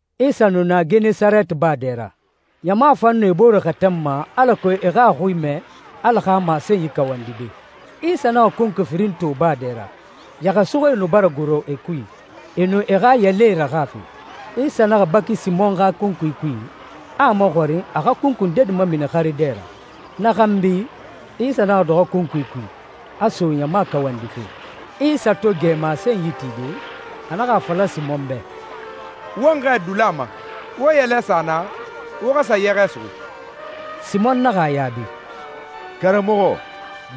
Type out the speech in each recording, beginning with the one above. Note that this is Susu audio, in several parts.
Isa nu na Genesareti baa dɛ ra. Ɲama fan nu e bore xɛtɛnma alako e xa a xui mɛ Ala xa masenyi kawandide. Isa naxa kunkui firin to baa dɛ ra. Yɛxɛsuxuie nu bara goro e kui, e nu e xa yɛlɛe raxafe. Isa naxa baki Simɔn xa kunkui kui, a a maxɔrin a xa kunkui ndedi mamini xare dɛ ra. Na xanbi, Isa naxa dɔxɔ kunkui kui, a so ɲama kawandife. Isa to gɛ masenyi tide, a naxa a fala Simɔn bɛ, «Won xɛɛ dula ma. Wo yɛlɛ sa naa, wo xa sa yɛxɛ suxu.» Simɔn naxa a yaabi, «Karamɔxɔ,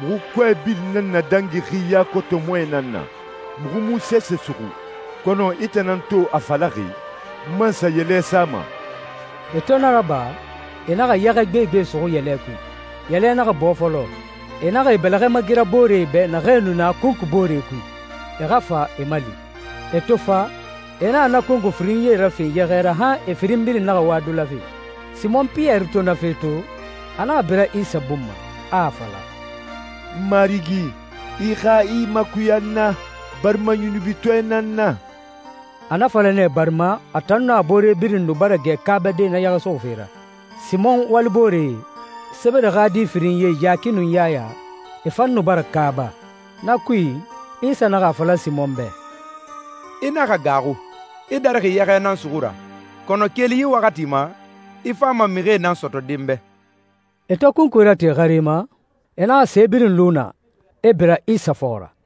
muxu kɔɛ birin nan nadangixi yakotomɔɛ nan na, muxu mu sese suxu. Kɔnɔ i tan nan to a falaxi, n man sa yɛlɛ sama.» E to na raba, e naxa yɛxɛ gbegbe suxu yɛlɛ kui, yɛlɛ naxa bɔɔ fɔlɔ. E naxa e bɛlɛxɛ magira booree bɛ naxee nu na kunkui boore kui, e xa fa e mali. E to fa, e naxa na kunkui firinyie rafe yɛxɛ ra han e firin birin naxa wa dulafe. Simɔn Piyɛri to na fe to, a naxa bira Isa bun ma, a a fala, «Marigi, i xa i makuya n na, barima yunubitɔɛ nan n na!» A na fala nɛ barima a tan nun a boore birin nu bara gɛ kaabade na yɛxɛ suxufe ra, Simɔn walibooree, Sebede xa di firinyie Yaki nun Yaya, e fan nu bara kaaba. Na kui, Isa naxa a fala Simɔn bɛ, «I naxa gaaxu. I darixi yɛxɛ nan suxu ra, kɔnɔ keli yi waxati ma, i fama mixie nan sɔtɔde n bɛ.» E to kunkui rate xare ma, e naxa se birin lu naa, e bira Isa fɔxɔ ra.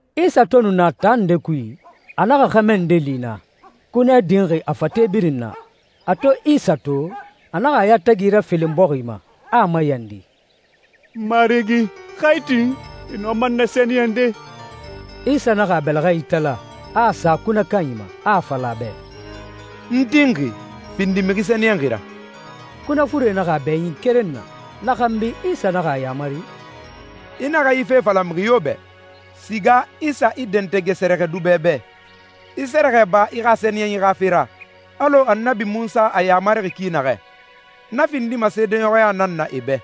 Isa to nu na taa nde kui, a naxa xɛmɛ nde li naa, kunɛ dinxi a fate birin na. A to Isa to, a naxa a yatagi rafelen bɔxi ma, a a mayandi, «N Marigi, xa i tin, i nɔma n nasɛniyɛnde.» Isa naxa a bɛlɛxɛ itala, a a sa kunɛ kanyi ma, a a fala a bɛ, «N tinxi. Findi mixi sɛniyɛnxi ra.» Kunɛ fure naxa a bɛɲin keren na. Na xanbi, Isa naxa a yamari, «I naxa yi fe fala mixi yo bɛ. Siga i sa i dɛntɛgɛ sɛrɛxɛdubɛ bɛ, i sɛrɛxɛ ba i xa sɛniyɛnyi xa fe ra, alɔ Annabi Munsa a yamarixi ki naxɛ. Na findima seedeɲɔxɔya nan na e bɛ.»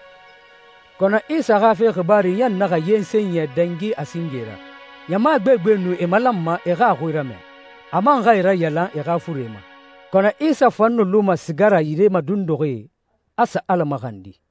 Kɔnɔ Isa xa fe xibaaru ɲan naxa yensen yɛ dangi a singe ra. Ɲama gbegbe nu e malanma e xa a xui ramɛ, a man xa e rayalan e xa furee ma. Kɔnɔ Isa fan nu luma siga ra yire madunduxie, a sa Ala maxandi.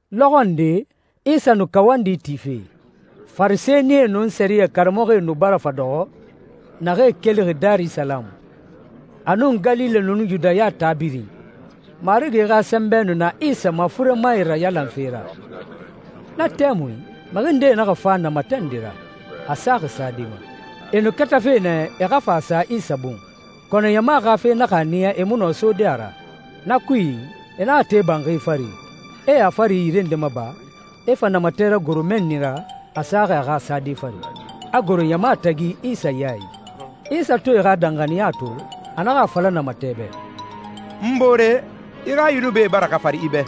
Lɔxɔ nde, Isa nu kawandi tife. Farisɛnie nun sɛriyɛ karamɔxɔe nu bara fa dɔxɔ, naxee kelixi Darisalamu, a nun Galile nun Yudaya taa birin. Marigi xa sɛnbɛ nu na Isa ma furemae rayalanfe ra. Na tɛmui, mixi ndee naxa fa namatɛ nde ra, a saxi sade ma. E nu katafe nɛ e xa fa a sa Isa bun, kɔnɔ ɲama xa fe naxa a niya e mu nɔ sode a ra. Na kui, e naxa te banxi fari, e a fari yire nde maba, e fa namatɛ ragoro mɛnni ra, a saxi a xa sade fari, a goro ɲama tagi Isa ya i. Isa to e xa danxaniya to, a naxa a fala namatɛ bɛ, «N boore, i xa yunubie bara xafari i bɛ.»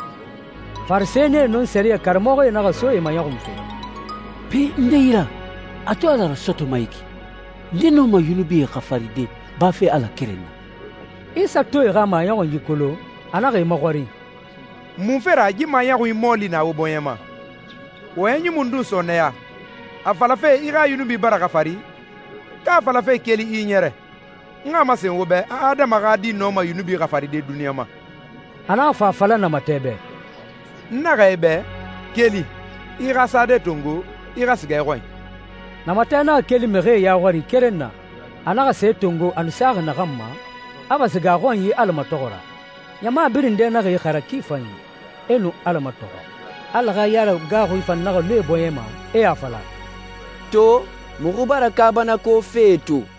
Farisɛnie nun sɛriyɛ karamɔxɔe naxa so e maɲɔxunfe, «Pe, nde yi ra, a to Ala rasɔtɔma yi ki? Nde nɔma yunubie xafaride, bafe Ala keren na?» Isa to e xa maɲɔxunyi kolon, a naxa e maxɔrin, «Munfe ra yi maɲɔxunyi mɔɔli na wo bɔɲɛ ma? Wɔyɛnyi mundun sɔɔnɛya, a falafe ‹I xa yunubie bara xafari,› ka a falafe ‹Keli, i ɲɛrɛ›? N xa a masen wo bɛ a Adama xa Di nɔma yunubi xafaride duniɲa ma.» A naxa fa a fala namatɛ bɛ, «N naxɛ i bɛ, keli, i xa sade tongo, i xa siga i xɔnyi.» Namatɛ naxa keli mixie ya xɔri keren na. A naxa se tongo a nu saxi naxan ma, a fa siga a xɔnyi Ala matɔxɔ ra. Ɲama birin dɛ naxa ixara ki fanyi, e nu Ala matɔxɔ. Ala xa yaragaaxui fan naxa lu e bɔɲɛ ma, e a fala, «To, muxu bara kaabanako fee to.»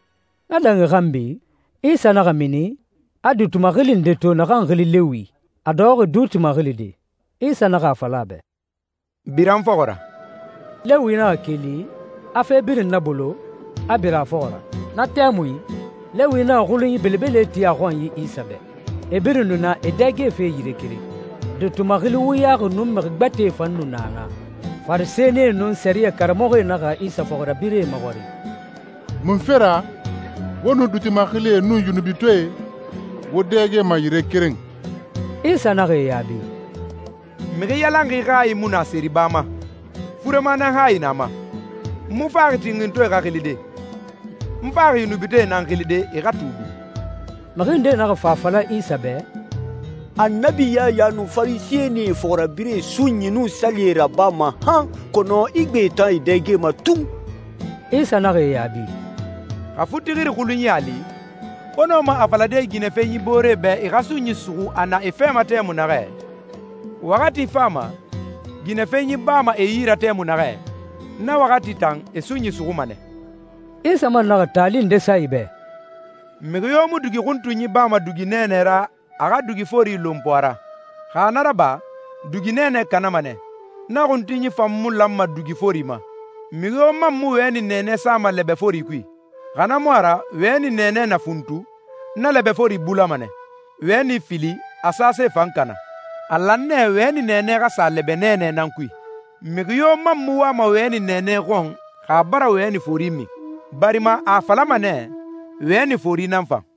Na dangi xanbi, Isa naxa mini, a duuti maxili nde to naxan xili Lewi, a dɔxɔxi duuti maxilide. Isa naxa a fala a bɛ, «Bira n fɔxɔ ra.» Lewi naxa keli, a fe birin nabolo, a bira a fɔxɔ ra. Na tɛmui, Lewi naxa xulunyi belebele ti a xɔnyi Isa bɛ. E birin nu na e dɛgefe yire keren, duuti maxili wuyaxi nun mixi gbɛtɛe fan nu na naa. Farisɛnie nun sɛriyɛ karamɔxɔe naxa Isa fɔxirabirɛe maxɔrin, «Munfe ra wo nun duuti maxilie nun yunubitɔɛe wo dɛgema yire keren?» Isa naxa e yaabi, «Mixi yalanxi hayi mu na seriba ma. Furema nan hayi na a ma. N mu faxi tinxintɔɛe xa xilide. N faxi yunubitɔɛe nan xilide, e xa tuubi.» Mixi ndee naxa fa a fala Isa bɛ, «Annabi Yaya nun Farisɛnie fɔxirabirɛe sunyi nun salie rabama han, kɔnɔ i gbee tan e dɛgema tun.» Isa naxa e yaabi, «Xa futixiri xulunyi a li, wo nɔma a falade ginɛfenyi booree bɛ e xa sunyi suxu a na e fɛ ma tɛmui naxɛ? Waxati fama, ginɛfenyi bama e yi ra tɛmui naxɛ. Na waxati tan, e sunyi suxuma nɛ.» Isa man naxa taali nde sa e bɛ, «Mixi yo mu dugi xuntunyi bama dugi nɛɛnɛ ra a xa dugi fori lonpo a ra. Xa na raba, dugi nɛɛnɛ kanama nɛ, na xuntunyi fan mu lanma dugi fori ma. Mixi yo man mu wɛni nɛɛnɛ sama lɛbɛ fori kui, xa na mu a ra wɛni nɛɛnɛ na funtu, na lɛbɛ fori bulama nɛ, wɛni fili, a sase fan kana. A lan nɛ wɛni nɛɛnɛ xa sa lɛbɛ nɛɛnɛ nan kui. Mixi yo man mu wama wɛni nɛɛnɛ xɔn xa a bara wɛni fori min, barima a a falama nɛ, ‹Wɛni fori nan fan.›»